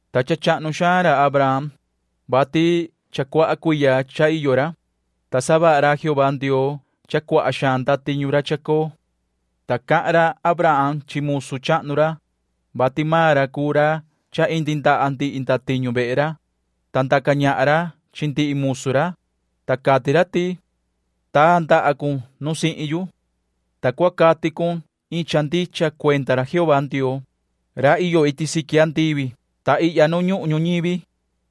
Ta cha chahnu xaan ra Abraham, vati cha cuaha cuiya cha iyo ra, ta savaha ra Jehová Ndioo cha cuaha xaan ndatiñu ra chacoo. Ta cahan ra Abraham chi musu chahnu ra, vati maan ra cuu ra cha indi ndaha ndihi ndatiñu vehe ra, ta ndaca ñahan ra chi ndihi musu ra, ta cati ra ti: ―Taa ndaha cun nu sihin yu. Ta cua cati cun iin cha ndicha cuenda ra Jehová Ndioo, ra iyo iti siqui andivi ta ihya nu ñuhun ñuñivi,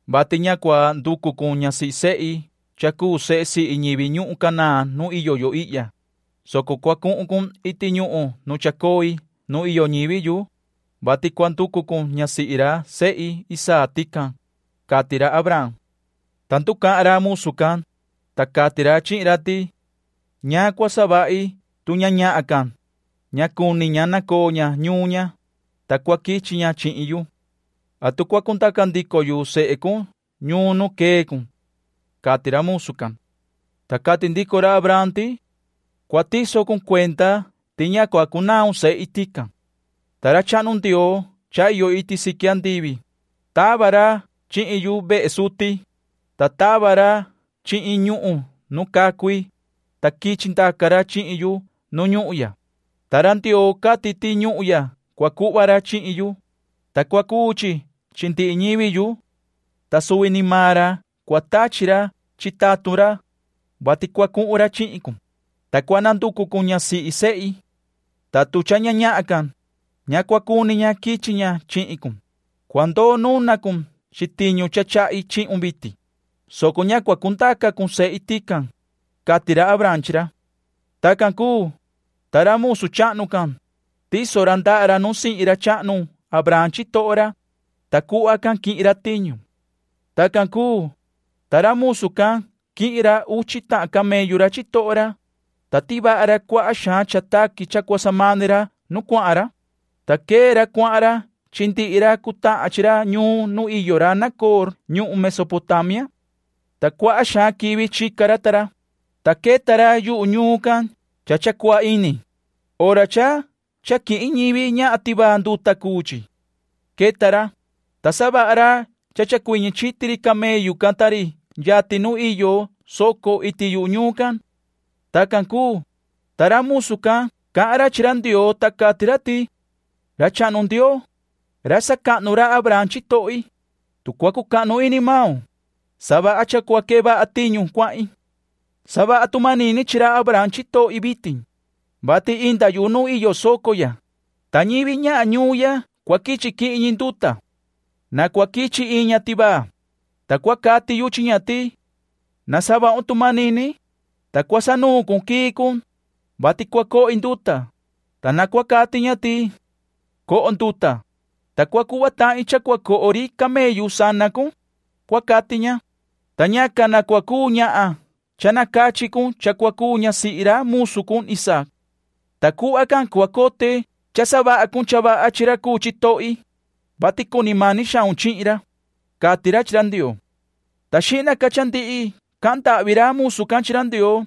vati ña cua nducu cun ñasihi sehi cha cuu sehe sihi ñivi ñuhun Canaán nu iyo yo ihya, soco cua cuhun cun iti ñuhun nu chacoi nu iyo ñivi yu, vati cua nducu cun ñasihi ra sehi Isaac tican ―cati ra Abraham. Ta nducahan ra musu can, ta cati ra chihin ra ti: ―¿Ñaan cua savahi tu ña ñahan can, ña cuni ña nacoo ña ñuun ña, ta cua quichi ña chihin yu? ¿Atu cua cundaca ndico yu sehe cun ñuun nu quee cun? ―cati ra musu can. Ta cati ndico ra Abraham ti: ―Cua tiso cun cuenda ti ña cua cunaun sehi tican. Ta ra chahnu Ndioo cha iyo iti siqui andivi, tava ra chihin yuvehe suti, ta tava ra chihin ñuhun nu cacui, ta quichi ndaca ra chihin yu nu ñuhun ya, ta ra Ndioo cati ti ñuhun ya cua cuhva ra chihin yu, ta cua cuu chi chi ndihi ñivi yu. Ta suvi ni maan ra cua tachi ra chi tatun ra, vati cua cuhun ra chihin cun, ta cua nanducu cun ñasihi sehi. Ta tu cha ña ñahan can, ña cua cuni ña quichi ña chihin cun, cua ndoo nuna cun chi tiñu cha chahi chihun vitin, soco ña cua cundaca cun sehi tican ―cati ra Abraham chi ra. Tacan cuu, ta ra musu chahnu can, tiso ra ndaha ra nu sihin ra chahnu Abraham chitoho ra, ta cuhva can quihin ra tiñu. Tacan cuu, ta ra musu can quihin ra uchi tahan camellu ra chitoho ra, ta tivaha ra cuaha xaan cha taqui cha cua samani ra nu cuahan ra, ta quee ra cuahan ra chi ndihi ra cutahan chi ra ñuun nu iyo ra Nacoor ñuhun Mesopotamia. Ta cuaha xaan quivi chica ra ta ra, ta queta ra yuhu ñuun can cha cha cua ini, hora cha cha quihin ñivi ñahan tivaa nduta cuu chi. Queta ra, ta savaha ra cha chacuiñi chiti ri camellu can ta ri yatin nu iyo soco iti yuhu ñuun can. Tacan cuu, ta ra musu can cahan ra chi ra Ndioo, ta cati ra ti:” Ra chahnu Ndioo, ra sacahnu ra Abraham chitohi, tu cua cucahnu ini maun, savaha cha cua quee vaha tiñu cuahin. Savaha tu manini chi ra Abraham chitohi vitin, vati inda yu nu iyo soco ya, ta ñivi ñahan ñuun ya cua quichi quihin ñi nduta. Na cua quichi iin ña tivaa, ta cua cati yu chi ña ti: ‘Na savahun tu manini, ta cua sanuun cun quii cun, vati cua cohi nduta’, ta na cua cati ña ti: ‘Coho nduta, ta cua cuhva tahin cha cua coho ri camellu sana cun’, cua cati ña, ta ñacan na cua cuu ñahan cha nacachi cun cha cua cuu ñasihi ra musu cun Isaac. Ta cuhva can cua cote cha savaha cun cha vaha chi ra cuu chitohi, vati cuni mani xaun chihin ra”, cati ra chi ra Ndioo. Ta xihna ca cha ndihi cahan ndahvi ra musu can chi ra Ndioo,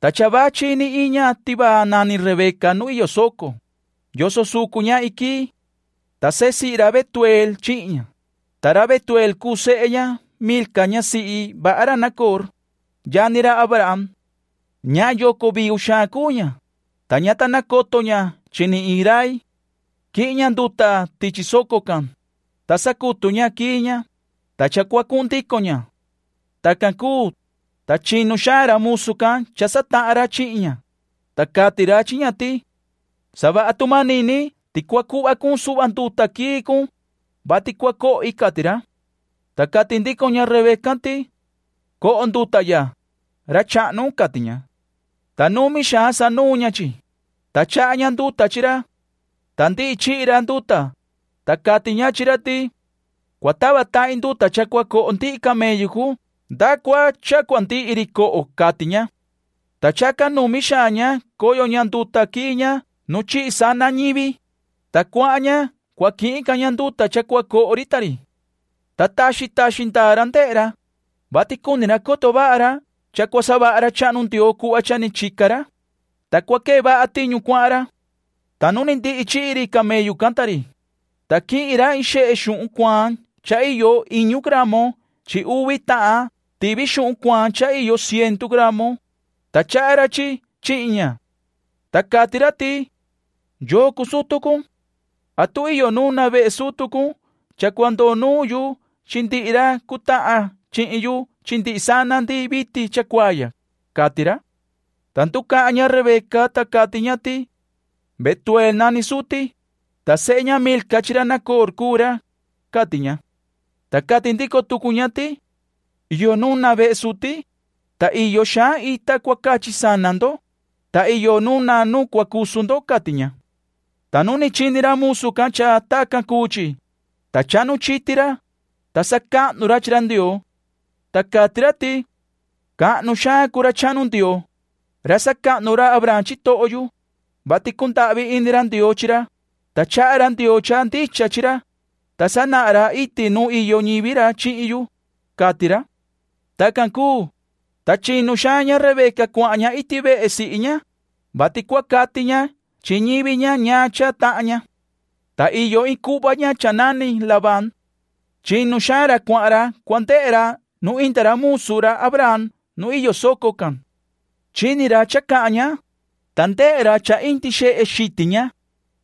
ta cha vachi ni iin ña tivaa nani Rebeca nu iyo soco, yoso sucu ña iin quii. Ta sehe sihi ra Betueel chihin ña, ta ra Betuel cuu sehe ña Milca ñasihi vaha ra Nacoor, yani ra Abraham. Ñahan yoco viu xaan cuu ña, ta ña ta nacoto ña chi ni iin rai. Quihin ña nduta tichi soco can, ta sacutu ña quii ña, ta cha cua cuhun ndico ña. Tacan cuu, ta chinu xaan ra musu can cha satahan ra chihin ña, ta cati ra chi ña ti: ―Savaha tu manini ti cua cuhva cun suhva nduta quii cun, vati cua cohi ―cati ra. Ta cati ndico ña Rebeca can ti: ―Coho nduta ya, ra chahnu ―cati ña. Ta numi xaan sanuun ña chi, ta chaha ña nduta chi ra. Ta ndihi chihi ra nduta, ta cati ña chi ra ti: ―Cua tava tahin nduta cha cua coho ndihi camellu cun nda cua cha cua ndihi ri coho ―cati ña. Ta chacan numi xaan ña coyo ña nduta quii ña nu chihi sana ñivi, ta cuahan ña cua quihin ca ña nduta cha cua coho ri ta ri. Ta taxi taxi ndaa ra ndehe ra, vati cuni ra coto vaha ra cha cua savaha ra chahnu Ndioo cuhva cha ni chica ra, ta cua quee vaha tiñu cuahan ra. Ta nu ni ndihi chihi ri camellu can ta ri, ta quihin ra iin xehe xuhun cuaan cha iyo iñu gramo chi uvi tahan tivi xuhun cuaan cha iyo cientu gramo, ta chaha ra chi chihin ña. Ta cati ra ti: ―¿Yoo cuu sutu cun? ¿Atu iyo nu nuna vehe sutu cun cha cua ndoo nuun yu chi ndihi ra cutahan chihin yu chi ndihi sana ndi vitin chacuaa ya? ―cati ra. Ta nducahan ña Rebeca, ta cati ña ti: ―Betueel nani suti, ta sehe ña Milca chi ra Nacoor cuu ra ―cati ña. Ta cati ndico tucu ña ti: ―Iyo nu nuna vehe suti, ta iyo xaan ita cua cachi sana ndo, ta iyo nu nuna nu cua cusu ndo ―cati ña. Ta nu chini ra musu can cha tacan cuu chi, ta chahnu chiti ra, ta sacahnu ra chi ra Ndioo. Ta cati ra ti: “Cahnu xaan cuu ra chahnu Ndioo, ra sacahnu ra Abraham chitoho yu, vati cundahvi ini ra Ndioo chi ra, ta chaha ra Ndioo cha ndicha chi ra, ta sanahan ra iti nu iyo ñivi ra chihin yu”, cati ra. Tacan cuu, ta chinu xaan ña Rebeca cuahan ña iti vehe sihi ña, vati cua cati ña chi ñivi ña ñaan cha tahan ña. Ta iyo iin cuhva ña cha nani Labán. Chinu xaan ra cuahan ra cua ndehe ra nu inda ra musu ra Abraham nu iyo soco can. Chini ra cha cahan ña, ta ndehe ra cha indi xehe xitin ña,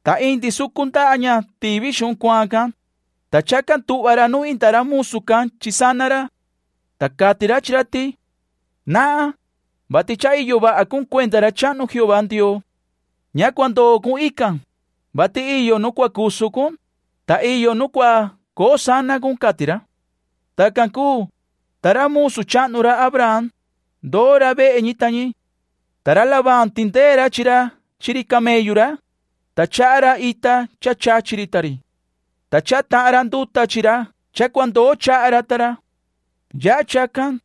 ta indi sucu ndaha ña tivi xuhun cuaan can, ta chacan tuhva ra nu inda ra musu can chi sana ra. Ta cati ra chi ra ti: ―Nahan, vati cha iyo vaha cun cuenda ra chahnu Jehová Ndioo. Ña cua ndoo cun ican, vati iyo nu cua cusu cun, ta iyo nu cua coo sana cun ―cati ra. Tacan cuu, ta ra musu chahnu ra Abraham, ndoo ra vehe ñi ta ñi. Ta ra Labán tindee ra chi ra chi ri camellu ra, ta chaha ra ita cha chachi ri ta ri. Ta chaha tahan ra nduta chi ra cha cua ndoo chaha ra ta ra. Yaha chacan,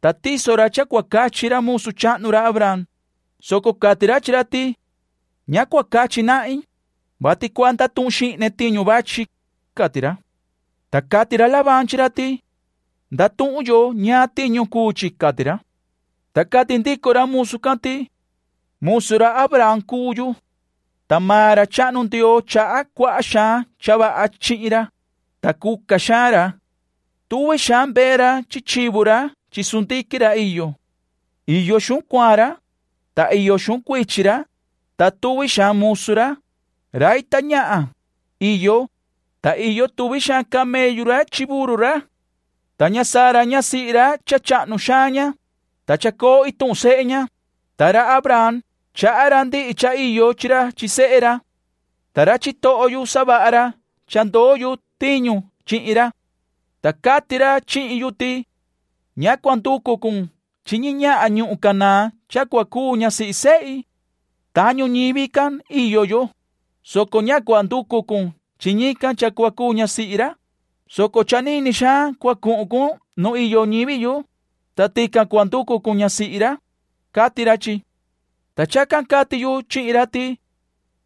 ta tiso ra cha cua cachi ra musu chahnu ra Abraham, soco cati ra chi ra ti: ―Ña cua cachi nahin, vati cua ndatuhun xihne tiñu vachi ―cati ra. Ta cati ra Labán chi ra ti: ―Ndatuhun yoho ñaan tiñu cuu chi ―cati ra. Ta cati ndico ra musu can ti: ―Musu ra Abraham cuu yu. Ta maan ra chahnu Ndioo chaha cuaha xaan cha vaha chihin ra, ta cuca xaan ra. Tuvi xaan mbee ra chi chivu ra chi sundiquin ra iyo. Iyo xuhun cuaan ra, ta iyo xuhun cuichin ra, ta tuvi xaan musu ra, rai ta ñahan, iyo, ta iyo tuvi xaan camellu ra chi burru ra. Ta ña Sara ñasihi ra cha chahnu xaan ña, ta chacoo ituhun sehe ña. Ta ra Abraham chaha ra ndihi cha iyo chi ra chi sehe ra. Ta ra chitoho yu savaha ra cha ndoo yu tiñu chihin ra. Ta cati ra chihin yu ti: ‘Ña cua nducu cun chi ñi ñahan ñuhun Canaán cha cua cuu ñasihi sehi. Tañu ñivi can iyo yo, soco ña cua nducu cun chi ñican cha cua cuu ñasihi ra, soco cha nini xaan cua cuhun cun nu iyo ñivi yu, ta tican cua nducu cun ñasihi ra’, cati ra chi. Ta chacan cati yu chihin ra ti: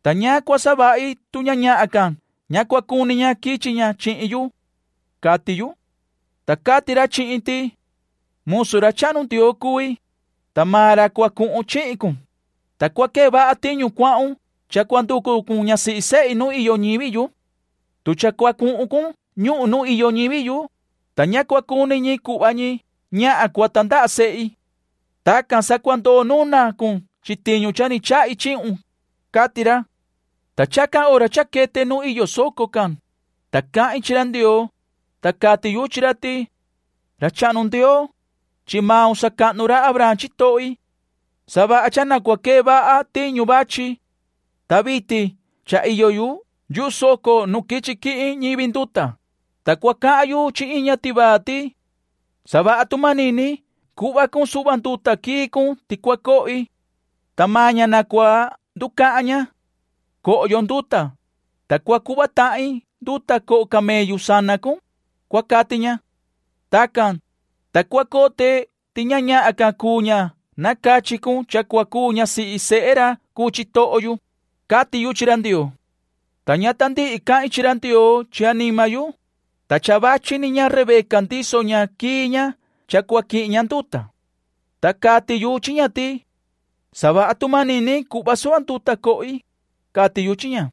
‘¿Ta ñaan cua savahi tu ña ñahan can ña cua cuni ña quichi ña chihin yu?’, cati yu. Ta cati ra chihin ti: ‘Musu ra chahnu Ndioo cui, ta maan ra cua cuhun chihin cun, ta cua quee vaha tiñu cuahun cha cua nducu cun ñasihi sehi nu iyo ñivi yu. Tu cha cua cuhun cun ñuhun nu iyo ñivi yu, ta ña cua cuni ñi cuhva ñi ñahan cua tandaha sehi. Tacan sa cua ndoo nuna cun chi tiñu cha ni chahi chihin cun’, cati ra. “Ta chacan hora cha quete nu iyo soco can, ta cahin chi ra Ndioo, ta cati yu chi ra ti: ‘Ra chahnu Ndioo, chi maun sacahnu ra Abraham chitohi. Savaha cha na cua quee vaha tiñu vachi. Ta vitin cha iyo yu yuhu soco nu quichi quihin ñivi nduta, ta cua cahan yu chi iin ña tivaa ti: Savaha tu manini cuhva cun suhva nduta quii cun ti cua cohi. Ta maan ña na cua nducahan ña: Coho yo nduta, ta cua cuhva tahin nduta coho camellu sana cun, cua cati ña. Tacan, ta cua cote ti ña ñahan can cuu ña nacachi cun cha cua cuu ñasihi sehe ra cuu chitoho yu’, cati yu chi ra Ndioo. Ta ña ta ndihi cahin chi ra Ndioo chi anima yu, ta cha vachi ni ña Rebeca ndiso ña quii ña cha cua quihin ña nduta. Ta cati yu chi ña ti: ‘Savaha tu manini cuhva suhva nduta cohi’, cati yu chi ña.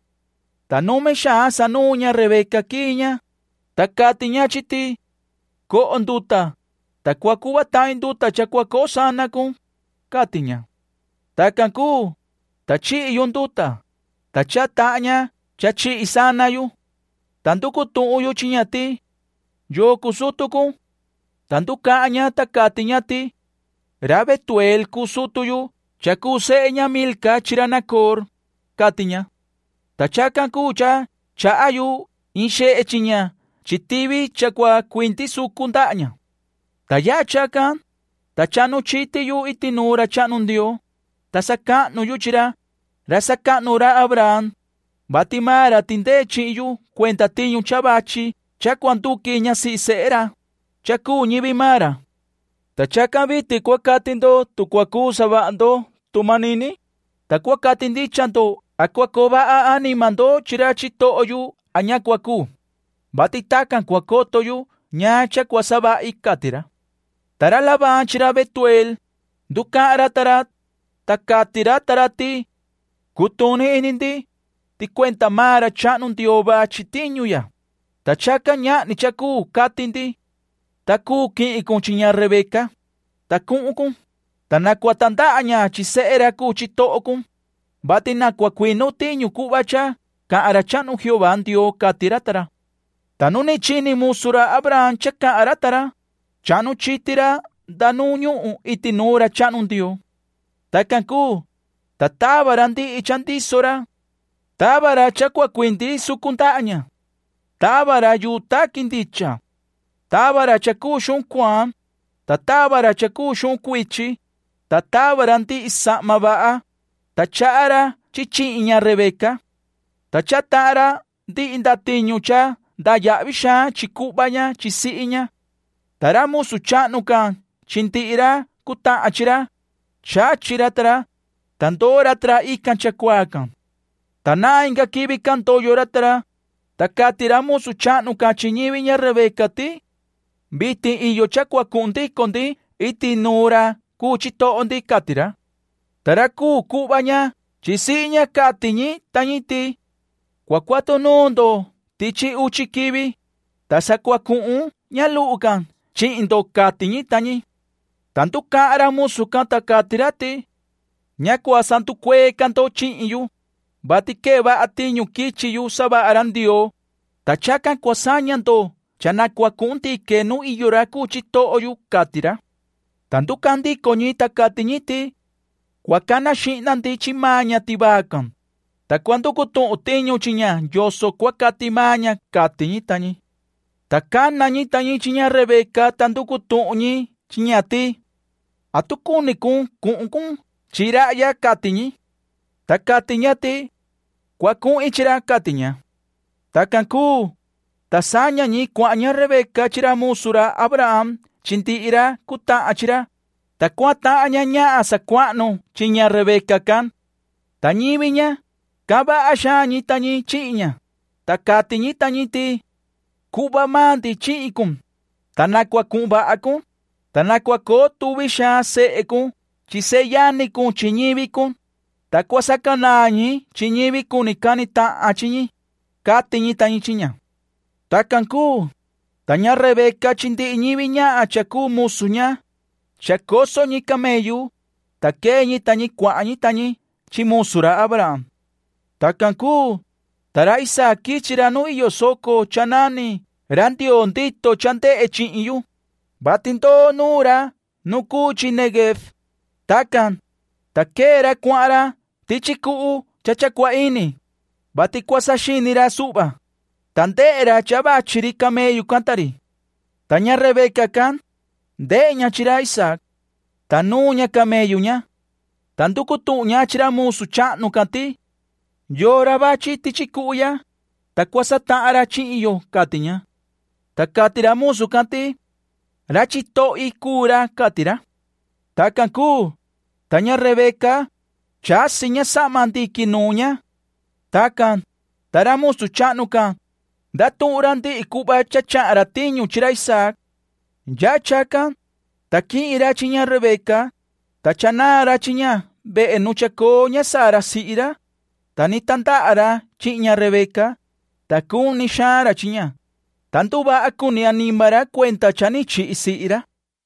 Ta numi xaan sanuun ña Rebeca quii ña, ta cati ña chi ti: ‘Coho nduta, ta cua cuhva tahin nduta cha cua coho sana cun’, cati ña. Tacan cuu, ta chihi yu nduta, ta chaha tahan ña cha chihi sana yu. Ta nducu tuhun yu chi ña ti: ‘¿Yoo cuu sutu cun?’ ta nducahan ña, ta cati ña ti: ‘Ra Betueel cuu sutu yu cha cuu sehe ña Milca chi ra Nacoor’, cati ña. Ta chacan cuu cha chaha yu in xehe chi ña chi tivi cha cua cuindi sucu ndaha ña. Ta yaha chacan, ta chahnu chiti yu iti nuun ra chahnu Ndioo, ta sacahnu yu chi ra, ra sacahnu ra Abraham, vati maan ra tindee chihin yu cuenda tiñu cha vachi cha cua nduqui ñasihi sehe ra, cha cuu ñivi maan ra. Ta chacan vitin cua cati ndo tu cua cuu savaha ndo tu manini, ta cua cati ndicha ndo a cua coo vaha anima ndo chi ra chitoho yu a ña cua cuu, vati tacan cua coto yu ñaan cha cua savahi”, cati ra. Ta ra Labán chi ra Betueel, nducahan ra ta ra, ta cati ra ta ra ti: ―Cutuni ini ndi, ti cuenda maan ra chahnu Ndioo vachi tiñu ya, ta chacan ñahni cha cuu cati ndi. Ta cuu quihin cun chi ña Rebeca, ta cuhun cun, ta na cua tandaha ña chi sehe ra cuu chitoho cun, vati na cua cuinu tiñu cuhva cha cahan ra chahnu Jehová Ndioo ―cati ra ta ra. Ta nu ni chini musu ra Abraham cha cahan ra ta ra, chahnu chiti ra nda nu ñuhun iti nuun ra chahnu Ndioo. Tacan cuu, ta tava ra ndihi cha ndiso ra. Tava ra cha cua cuindi sucu ndaha ña. Tava ra yuu taqui ndicha. Tava ra cha cuu xuhun cuaan, ta tava ra cha cuu xuhun cuichi, ta tava ra ndihi sahma vaha, ta chaha ra chi chihin ña Rebeca. Ta chaha tahan ra ndihi ndatiñu cha ndayahvi xaan chi cuhva ña chi sihi ña. Ta ra musu chahnu can chi ndihi ra cutahan chi ra, chachi ra ta ra, ta ndoo ra ta ra ican chacuaa can. Ta nahan inga quivi can ndoyo ra ta ra, ta cati ra musu chahnu can chi ñivi ña Rebeca ti: ―Vitin iyo cha cua cuhun ndico ndi iti nuun ra cuu chitoho ndi ―cati ra. Ta ra cuu cuhva ña chi sihi ña cati ñi ta ñi ti: ―Cua cuatu nuun ndo tichi uchi quivi, ta sa cua cuhun ña luhu can chihin ndo ―cati ñi ta ñi. Ta nducahan ra musu can, ta cati ra ti: ―Ña cua sanducuee ca ndo chihin yu, vati quee vaha tiñu quichi yu savaha ra Ndioo, ta chacan cua saña ndo cha na cua cuhun ndique nu iyo ra cuu chitoho yu ―cati ra. Ta nducahan ndico ñi, ta cati ñi ti: ―Cua cana xihna ndi chi maan ña tivaa can, ta cua nducu tuhun tiñu chi ña yoso cua cati maan ña ―cati ñi ta ñi. Ta cana ñi ta ñi chi ña Rebeca ta nducu tuhun ñi chi ña ti: ―¿Atu cuni cun cuhun cun chi rahya? ―cati ñi. Ta cati ña ti: ―Cua cuhin chi ra ―cati ña. Tacan cuu, ta saña ñi cuahan ña Rebeca chi ra musu ra Abraham chi ndihi ra cutahan chi ra, ta cuahan tahan ña ñahan sacuahnu chi ña Rebeca can. Ta ñivi ña, cahan vaha xaan ñi ta ñi chihin ña, ta cati ñi ta ñi ti: “Cuhva maan ndi chihin cun, ta na cuhun vaha cun, ta na cua coo tuvi xaan sehe cun chi seyani cun chi ñivi cun, ta cua sacanaan ñi chi ñivi cuni cani tahan chi ñi”, cati ñi ta ñi chi ña. Tacan cuu, ta ña Rebeca chi ndihi ñivi ñahan cha cuu musu ña, chacoso ñi camellu, ta quee ñi ta ñi cuahan ñi ta ñi chi musu ra Abraham. Tacan cuu, ta ra Isaac quichi ra nu iyo soco cha nani”Ra Ndioo ndito cha ndehe chihin yu”, vati ndoo nuun ra nu cuu chi Neguev. Tacan, ta quee ra cuahan ra tichi cuhu cha cha cua ini, vati cua saxini ra suhva, ta ndehe ra cha vachi ri camellu can ta ri. Ta ña Rebeca can, ndehe ña chi ra Isaac. Ta nuun ña camellu ña. Ta nducu tuhun ña chi ra musu chahnu can ti: ―¿Yoo ra vachi tichi cuhu ya, ta cua satahan ra chihin yo? ―cati ña. Ta cati ra musu can ti: ―Ra chitohi cuu ra ―cati ra. Tacan cuu, ta ña Rebeca, chasi ña sahma ndiqui nuun ña. Tacan, ta ra musu chahnu can, ndatuhun ra ndihi cuhva cha chahan ra tiñu chi ra Isaac. Yaha chacan, ta quihin ra chi ña Rebeca, ta cha naa ra chi ña vehe nu chacoo ña Sara sihi ra, ta ni tandaha ra chihin ña Rebeca, ta cuni xaan ra chi ña, ta nduvaha cuni anima ra cuenda cha ni chihi sihi ra.